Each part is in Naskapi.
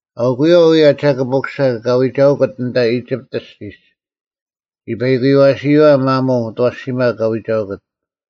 ᐊᐅᑯᔪᐛ ᐅᔭ ᒐᑭᑉ ᐅᑯᓴ ᑲ ᐎᒐᐅᑯᑦ ᐊᓐᑕ ᐃᒋᑉᑦ ᐊᔅᒋᒡ, ᒋ ᐸᐃᑯᓴᐳᔪᐛ ᒪᒧᐤ ᐅᑦ ᐊᐛᓯᒪ ᑲ ᐎᒐᐅᑯᑦ: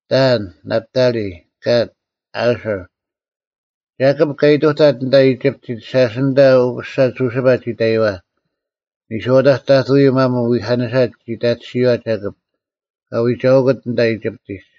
ᑕᐊᓐ, ᓇᑉᑕᓕ, ᑲᑦ, ᐊᓱᕐ᙮ ᒐᑭᑉ ᑲ ᐃᑐᑕᑦ ᐊᓐᑕ ᐃᒋᑉᑎᒡ, ᓴᔅ ᐊᓐᑕ ᐅᑯᓴ ᒍᓯᐸ ᒋ ᑕᔪᐛ᙮ ᓂᔄᐅᑕᒡ ᑕᑐᔪᐤ ᒪᒧᐤ ᐎᐧᑲᓂᓴ ᒋ ᑕᑎᓯᔨᐛ ᒐᑭᑉ, ᑲ ᐎᒐᐅᑯᑦ ᐊᓐᑕ ᐃᒋᑉᑎᒡ᙮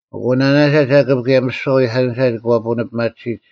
ᐊᑯ ᓇᓇᒐ ᒍᓯᑉ ᑭᔭ ᒥᓯᐛ ᐎᐧᑲᓂᓴ ᒂ ᐳᓂᐱᒪᑎᓯᒡ᙮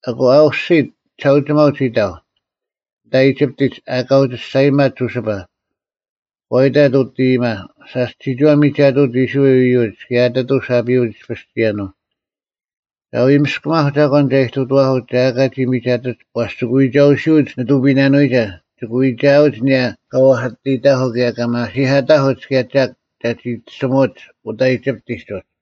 ᐊᑯ ᐊ ᐅᔅᒋᑦ ᒋᓴᐅᒋᒪᐊᐤ ᒋ ᑕᐤ, ᐊᓐᑕ ᐃᒋᑉᑎᒡ ᐊᑲ ᐅᒋ ᒋᔅᒐᔨᒪᑦ ᒍᓯᐸ᙮ ᒂ ᐃᑕᑦ ᐅᑦ ᐃᔨᒪ, “ᓴᔅ ᒋᒋᐛ ᒥᒐᑐᐅᒡ ᐃᔅᕋᐃᓪ ᐃᔪᒡ ᑭᔭ ᐊᑎᑐᐤ ᓴᐱᐅᒡ ᐃᔅᐱᔅ ᒋᔭᓄᐤ᙮ ᒐ ᐎ ᒥᔅᑲᒪᐧᒄ ᒐᒂᓐ ᒐ ᐃᑐᑐᐛᐧᑯᒡ ᒐ ᐊᑲ ᒋ ᒥᒐᑎᒡ ᐛᔅ ᒋᑭ ᐎᒐᐅᓯᐅᒡ ᓂᑐᐱᔨᓇᓄᐎᒐ ᒋᑭ ᐎᒐᐅᒡ ᐊᓂᔭ ᑲ ᐛᐧᑲᑎᔨᑕᐧᑯᐤ ᑭᔭ ᒐ ᒪᓯᐧᑲᑕᐧᑯᒡ ᑭᔭ ᒐᒃ ᒐ ᒋᑎᓯᒧᒡ ᐅᑕ ᐃᒋᑉᑎᒡ ᐅᒡ᙮”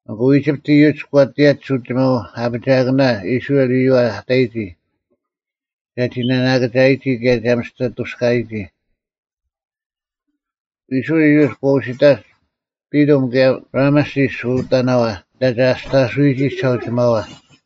ᐊᑯ ᐃᒋᑉᑦ ᐃᔪᒡ ᒂ ᑎᔭᒡ ᐅᒋᒪᐤ ᐊᐱᒋᐊᑭᓇ ᐃᔅᕋᐃᓪ ᐃᔪᐛ ᐊ ᑕᔨᒋ ᒐᒋ ᓇᓇᑭᒐᔨᒋ ᑭᔭ ᒐ ᒥᔅᑎ ᐊᑐᔅᑲᐊᔨᒋ᙮ ᐃᔅᕋᐃᓪ ᐃᔪᒡ ᒂ ᐅᓯᑕᒡ ᐱᑐᒻ ᑭᔭ ᕋᒪᓯᔅ ᐅᑕᓇᐛ, ᐊᓐᑕ ᒐ ᐊᔅᑕᓱᐅᔨᒋ ᒋᓴᐅᒋᒪᐛ᙮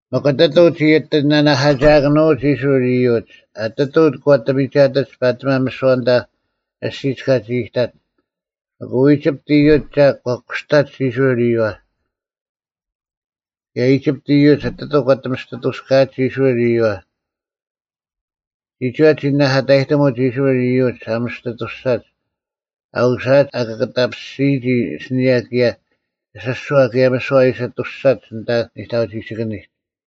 ᒥᒄ ᐊᑎᑐᐤ ᒋ ᐊᑎ ᓇᐧᑲᒐᑭᓄᐅᒡ ᐃᔅᕋᐃᓪ ᐃᔪᒡ, ᐊᑎᑐᐤ ᒂ ᐊᑎ ᒥᒐᑎᒡ ᐸᑎᒪ ᒥᓯᐛ ᐊᓐᑕ ᐊᔅᒋᒡ ᑲᒋ ᐃᑕᒡ᙮ ᐊᑯ ᐃᒋᑉᑦ ᐃᔪᒡ ᒐᒃ ᒂ ᑯᔅᑕᒡ ᐃᔅᕋᐃᓪ ᐃᔪᐛ᙮ ᑭᔭ ᐃᒋᑉᑦ ᐃᔪᒡ ᐊᑎᑐᐤ ᒂ ᐊᑎ ᒥᔅᑎ ᐊᑐᔅᑲᐊᒡ ᐃᔅᕋᐃᓪ ᐃᔪᐛ᙮ ᒋᒋᐛ ᒋ ᓂᓇᐧᑲᑕᔨᑎᒧᒡ ᐃᔅᕋᐃᓪ ᐃᔪᒡ ᐊ ᒥᔅᑎ ᐊᑐᔅᒐᒡ ᐊ ᐅᓯᐊᒡ ᐊ ᑭᒋᒐᔭᐱᔅᒋᔨᒋ ᐊᓯᓂᔭ ᑭᔭ ᐊᓯᔅᒍᐛ ᑭᔭ ᒥᓯᐛ ᐊ ᐃᓯ ᐊᑐᔅᒐᒡ ᐊᓐᑕ ᓂᑕᐅᒋᒋᑭᓂᒡ᙮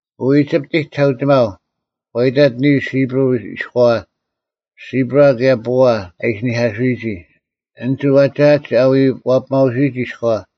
ᐊᑯ ᐃᒋᑉᑎᒡ ᒋᓴᐅᒋᒪᐤ ᒂ ᐃᑕᑦ ᓂᓱ ᐃᑉᕈᐤ ᐃᔎᐛ, ᓯᑉᕋ ᑭᔭ ᐳᐊ ᐊ ᐃᓯᓂᐧᑲᓱᔨᒋ, ᐊᓐᒡ ᐛᒐᐅᒡ ᐊ ᐎ ᐛᐱᒪᐅᓱᔨᒋ ᐃᔎᐛ᙮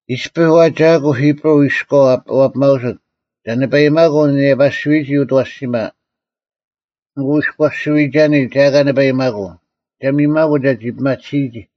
“ᐃᔅᐱ ᐛᒐᐊᑯ ᐃᑉᕈᐤ ᐃᔎᐤ ᐊ ᐛᐱᒪᐅᓱᑦ, ᒐ ᓂᐸᐃᒪᑯ ᓂᔭᐸᓯᐎᔨᒋ ᐅᑦ ᐊᐛᓯᒪ᙮ ᐊᑯ ᐃᔎᓯᐎᒐᓂ ᒐ ᐊᑲ ᓂᐸᐃᒪᑯ, ᒐ ᒥᔨᒪᑯ ᒐᒋ ᐱᒪᑎᓯᔨᒋ᙮”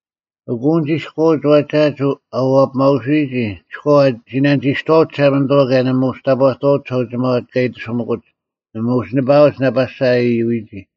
ᐊᑯ ᐊᓐᒡ ᐃᔎᐅᒡ ᐛᒐᐊᒡ ᐊ ᐛᐱᒪᐅᓯᔨᒋ ᐃᔎᐛ ᒋ ᓇᓂᒋᔅᑐᐛᐅᒡ ᒋᓴᒪᓂᑐᐛ ᑭᔭ ᓇᒪ ᐅᒋ ᑕᑈᑐᐛᐅᒡ ᒋᓴᐅᒋᒪᐛ ᑲ ᐃᑎᓱᒥᑯᒡ, ᓇᒪ ᐅᒋ ᓂᐸᐊᐅᒡ ᓇᐸᓴ ᐊ ᐃᔪᔨᒋ᙮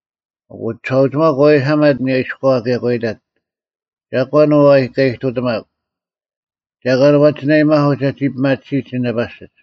ᐊᑯ ᒋᓴᐅᒋᒪᐤ ᒂ ᐎᓴᒪᑦ ᐊᓂᔭ ᐃᔎᐛ ᑭᔭ ᒂ ᐃᑕᑦ, “ᒐᒂᓐ ᐅ ᑲ ᐃᑐᑎᒪᒄ? ᒐᒂᓐ ᐛᒋ ᓇᐊᔨᒪᑯᒡ ᒐᒋ ᐱᒪᑎᓯᒡ ᐊᓐᒡ ᓇᐸᓯᒡ?”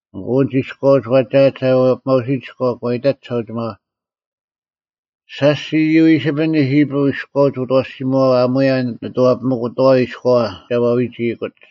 ᐊᑯ ᐊᓐᒡ ᐃᔎᐅᒡ ᐛᒐᐊᒡ ᐊ ᐛᐱᒪᐅᓯᔨᒋ ᐃᔎᐛ, ᒂ ᐃᑕᒡ ᒋᓴᐅᒋᒪᐛ, “ᓴᔅ ᒋ ᐃᔪᐃᓯᐱᓂ ᐃᑉᕈᐤ ᐃᔎᐅᒡ ᐅᑦ ᐊᐛᓯᒧᐛᐛ ᐊᒺᔭ ᓂᑐᐛᐱᒥᑯᑥᐎ ᐃᔎᐛ ᒐ ᐛᐎᒋᐃᑯᒡ᙮”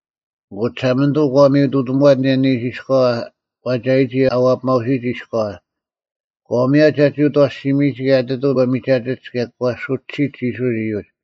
ᐊᑯ ᒋᓴᒪᓂᑐᐤ ᒂ ᒥᔪᑐᑐᐛᑦ ᐊᓂᔭ ᓂᓱ ᐃᔎᐛ ᐛᒐᔨᒋ ᐊ ᐛᐱᒪᐅᓱᔨᒋ ᐃᔎᐛ, ᒂ ᒥᔭᑦ ᒐᒋ ᐅᑦ ᐊᐛᓯᒥᔨᒋ ᑭᔭ ᐊᑎᑐᐤ ᒂ ᒥᒐᑎᒡ ᑭᔭ ᒂ ᓱᒋᓯᒡ ᐃᔅᕋᐃᓪ ᐃᔪᒡ᙮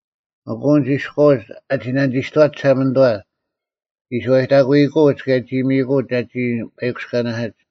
ᐊᑯ ᐊᓐᒡ ᐃᔎᐅᒡ ᐊᒋ ᓇᓂᒋᔅᑐᐛᒡ ᒋᓴᒪᓂᑐᐛ, ᒋ ᓱᐛᔨᑕᑯᐃᑯᐅᒡ ᑭᔭ ᒋ ᒥᔨᑯᐅᒡ ᒐᒋ ᐸᐃᑯᔅᑲᓇᓯᒡ᙮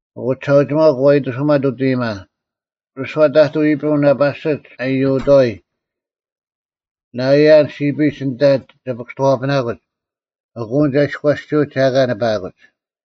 ᐊᑯ ᒋᓴᐅᒋᒪᐤ ᒂ ᐃᑎᓱᒪᑦ ᐅᑦ ᐃᔨᒪ, “ᒥᓯᐛ ᑕᑐᐤ ᐃᑉᕈᐤ ᓇᐸᓯᒡ ᐊ ᐃᔪᑥᐎ, ᓇᐃᔭᓪ ᓯᐱᒡ ᐊᓐᑕ ᒐ ᐱᑭᔅᑐᐛᐱᓇᑯᒡ, ᐊᑯ ᐊᓐᒡ ᐊ ᐃᔎᓯᐅᒡ ᒐ ᐊᑲ ᓂᐸᐊᑯᒡ᙮”